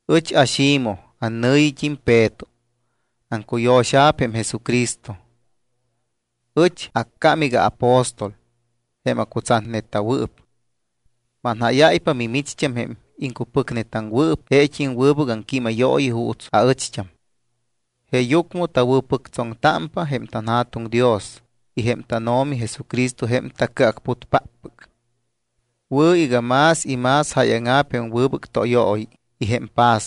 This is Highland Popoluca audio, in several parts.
Ɨch aXimoj annɨ̱yit́im Peto. Aŋcuyo̱xa̱p jém Jesucristo. Ɨch accám iga aapóstol, jém acutsatneta̱wɨɨp. Manjáyáypa mimicht́am jém iŋcupɨcnetaŋwɨɨp jeet́im wɨbɨc aŋquímayooyi juuts aɨcht́am. Jeeyucmɨ tawɨ̱pɨctsoŋtámpa jém tanJa̱tuŋ Dios y jém tánO̱mi Jesucristo jém taCɨacputpáppɨc. Wɨ̱ iga más y más jáyaŋa̱p jém wɨbɨc tóyooyi y jém paz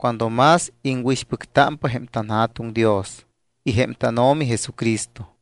cuando más iŋwɨ̱ixpɨctámpa jém tanJa̱tuŋ Dios y jém tánO̱mi Jesucristo.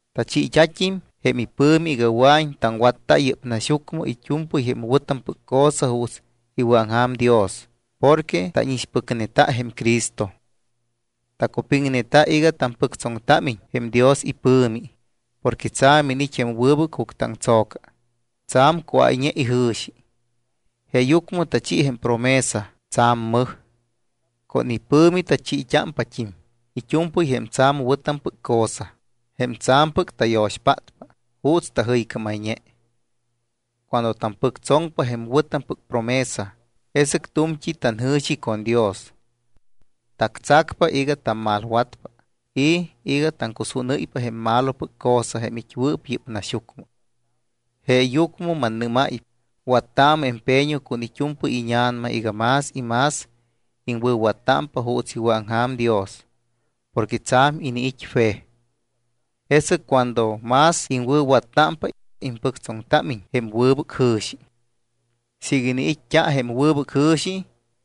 Tachiit́at́im jém ipɨ̱mi iga wɨa̱iñ taŋwatta yɨ́p naxyucmɨ it́u̱mpɨy jém wɨ̱tampɨc cosa juuts iwɨ̱aŋja̱m Dios porque tánixpɨcneta jém Cristo. Tacupiŋneta iga tampɨctsoŋtámiñ jém Dios ipɨ̱mi porque tsa̱m iniit́ jém wɨbɨc juctɨaŋtso̱ca, tsa̱m cuáyñe ijɨ̱xi. Jeeyucmɨ tachi jém promesa tsa̱m mɨj. Con ipɨ̱mi tachiit́ámpat́im it́u̱mpɨy jém tsa̱m wɨ̱tampɨc cosa, jém tsa̱mpɨc tayo̱xpátpa juuts tajɨycámayñe. Cuando tampɨctsoŋpa jém wɨ̱tampɨc promesa, jesɨc tu̱mt́i tanjɨ̱xi con Dios. Tactsacpa iga tammalwatpa y iga taŋcusúnɨ́ypa jém malopɨc cosa jém it́wɨɨp yɨ́p naxyucmɨ. Jeeyucmɨ mannɨ́máypa, wattaamɨ empeño con it́u̱mpɨy íña̱nama iga más y más iŋwɨ̱wattámpa juuts iwɨ̱aŋja̱m Dios porque tsa̱m iniit́ fe. Jesɨc cuando más iŋwɨ̱wattámpa, impɨctsoŋtámiñ jém wɨbɨc jɨ̱xi. Siiga iniit́t́a jém wɨbɨc jɨ̱xi,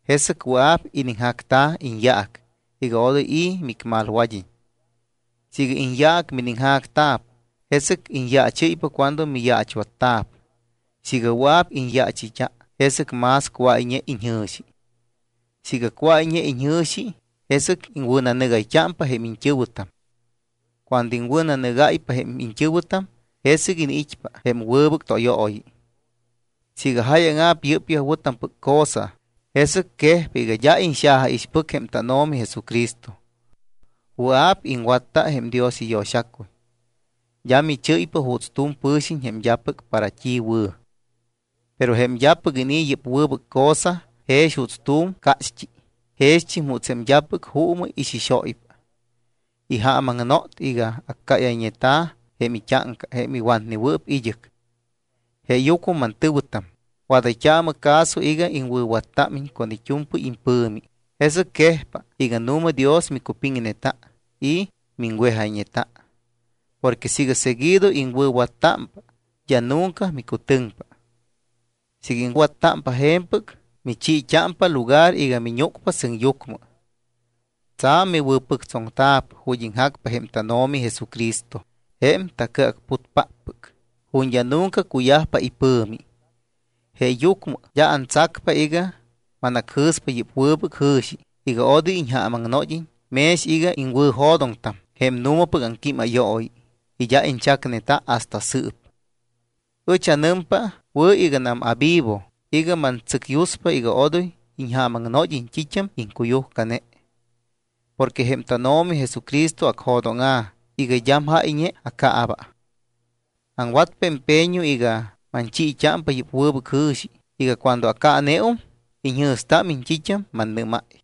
jesɨc wɨa̱p iniŋjacta̱ iñyaac iga odoy i̱ micmalwad́iñ. Siiga iñyaac miniŋjacta̱p, jesɨc iñyaachɨ́ypa cuando miyaachwatta̱p. Siiga wɨa̱p iñyaachɨyt́a, jesɨc más cuáyñe iñjɨ̱xi. Siiga cuáyñe iñjɨ̱xi, jesɨc iŋwɨ̱nanɨgayt́ámpa jém iñt́ɨ̱wɨtam. Cuando iŋwɨ̱nanɨgáypa jém iñt́ɨ̱wɨtam, jesɨc iniit́pa jém wɨbɨc tóyooyi. Siiga jáyaŋa̱p yɨ́pyaj wɨ̱tampɨc cosa, jesɨc quejpa iga d́a iñxajaixpɨc jém tánO̱mi Jesucristo. Wɨa̱p iŋwatta jém Dios iyo̱xacuy. D́a michɨ́ypa juuts tu̱m pɨ̱xiñ jém d́apɨc para t́i wɨ̱. Pero jém d́apɨc inii̱ yɨ́p wɨbɨc cosa jex juuts tu̱m cácht́i, jext́im juuts jém d́apɨc juumɨ ixixóypa. Ijaamaŋnot iga accáyayñeta̱ jém it́áŋca jém iwatnewɨɨp id́ɨc. Jeeyucmɨ mantɨ̱wɨtam, wadayt́aamɨ caso iga iŋwɨ̱wattámiñ con it́u̱mpɨy impɨ̱mi, jesɨc quejpa iga nu̱ma Dios micupiŋneta y miŋwejayñeta. Porque siiga seguido iŋwɨ̱wattámpa, d́a nunca micutɨŋpa. Siiga iŋwattámpa je̱mpɨc, michiit́ámpa lugar iga miñúcpa sɨŋyucmɨ. Tsa̱m miwɨ̱pɨctsoŋta̱p ju̱t́ iŋjacpa jém tánO̱mi Jesucristo, jém taCɨacputpáppɨc, ju̱t́ d́a nunca cuyajpa ipɨ̱mi. Jeeyucmɨ d́a antsacpa iga manacjɨ̱spa yɨ́p wɨbɨc jɨ̱xi iga odoy iñjaamaŋnod́iñ mex iga iŋwɨ̱jo̱doŋtam jém nu̱mapɨc aŋquímayooyi y d́a iñchacneta hasta sɨɨp. Ɨch anɨmpa wɨ̱ iganam avivo iga mantsɨcyuspa iga odoy iñjaamaŋnod́iñ t́it́am iŋcuyujcane. Porque jém tánO̱mi Jesucristo acjo̱dóŋa̱ iga d́am jáyñe acaaba. Aŋwatpa empeño iga manchiit́ámpa yɨ́p wɨbɨc jɨ̱xi iga cuando acaaneum, iñjɨ̱stámiñ t́it́am mannɨ́máy.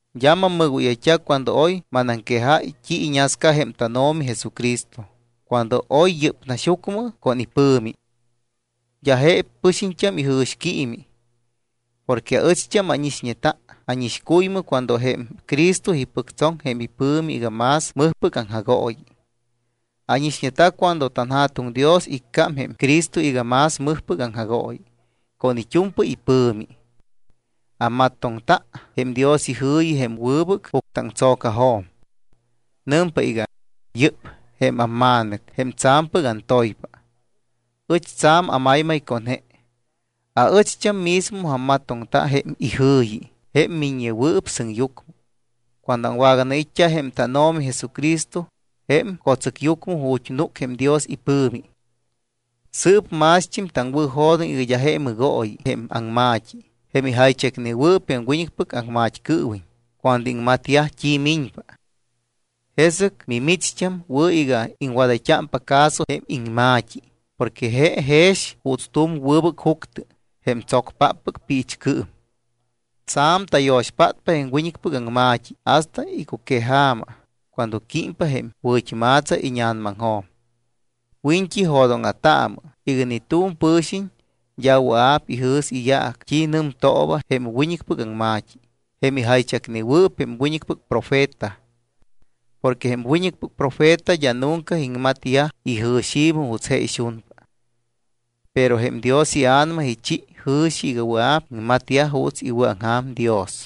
D́a mammɨgóyayt́a cuando oy manaŋquejáy t́i iñasca jém tánO̱mi Jesucristo, cuando oy yɨ́p naxyucmɨ con ipɨ̱mi. D́a je pɨxiñt́am ijɨ̱xquiimi. Porque aɨcht́am ánixñeta ánixcuymɨ cuando jém Cristo ipɨctsoŋ jém ipɨ̱mi iga más mɨjpɨc aŋjagooyi. Ánixñeta cuando jém tanJa̱tuŋ Dios iccám jém Cristo iga más mɨjpɨc aŋjagooyi con it́u̱mpɨy ipɨ̱mi. Ammatoŋta jém Dios ijɨ̱yi jém wɨbɨc juctɨaŋtso̱cajo̱m. Nɨmpa iga: “Yɨ́p jém amMa̱nɨc jém tsa̱mpɨc antoypa. Ɨch tsa̱m amaymay con je.” Aɨcht́am mismo ammatoŋta jém ijɨ̱yi, jém miññewɨɨp sɨŋyucmɨ, cuando aŋwaganait́t́a jém tánO̱mi Jesucristo jém co̱tsɨcyucmɨ ju̱t́ núc jém Dios ipɨ̱mi. Sɨɨp mást́im taŋwɨ̱jo̱doŋ iga d́a je mɨgooyi jém aŋma̱t́i jém ijaychacnewɨɨp jém wiñɨcpɨc aŋmat́cɨɨwiñ cuando iŋmatyaj t́i miñpa. Jesɨc mimicht́am wɨ̱ iga iŋwadayt́ámpa caso jém iŋma̱t́i porque je jex juuts tu̱m wɨbɨc juctɨ, jém tsocpáppɨc piichcɨɨm. Tsa̱m tayo̱xpátpa jém wiñɨcpɨc aŋma̱t́i hasta icuqueja̱ma cuando químpa jém wɨ̱t́ma̱tsa íña̱namaŋjo̱m. Wiñt́i jo̱dóŋa̱taamɨ iga ni tu̱m pɨ̱xiñ d́a wɨa̱p ijɨ̱s iyaac t́i nɨmtooba jém wiñɨcpɨc aŋma̱t́i, jém ijaychacneyajwɨɨp jém wiñɨcpɨc profeta. Porque jém wiñɨcpɨc profeta d́a nunca iŋmatyaj ijɨ̱xi̱mɨ juuts je ixunpa. Pero jém Dios iA̱nama ichi jɨ̱xi iga wɨa̱p iŋmatyaj juuts iwɨ̱aŋja̱m Dios.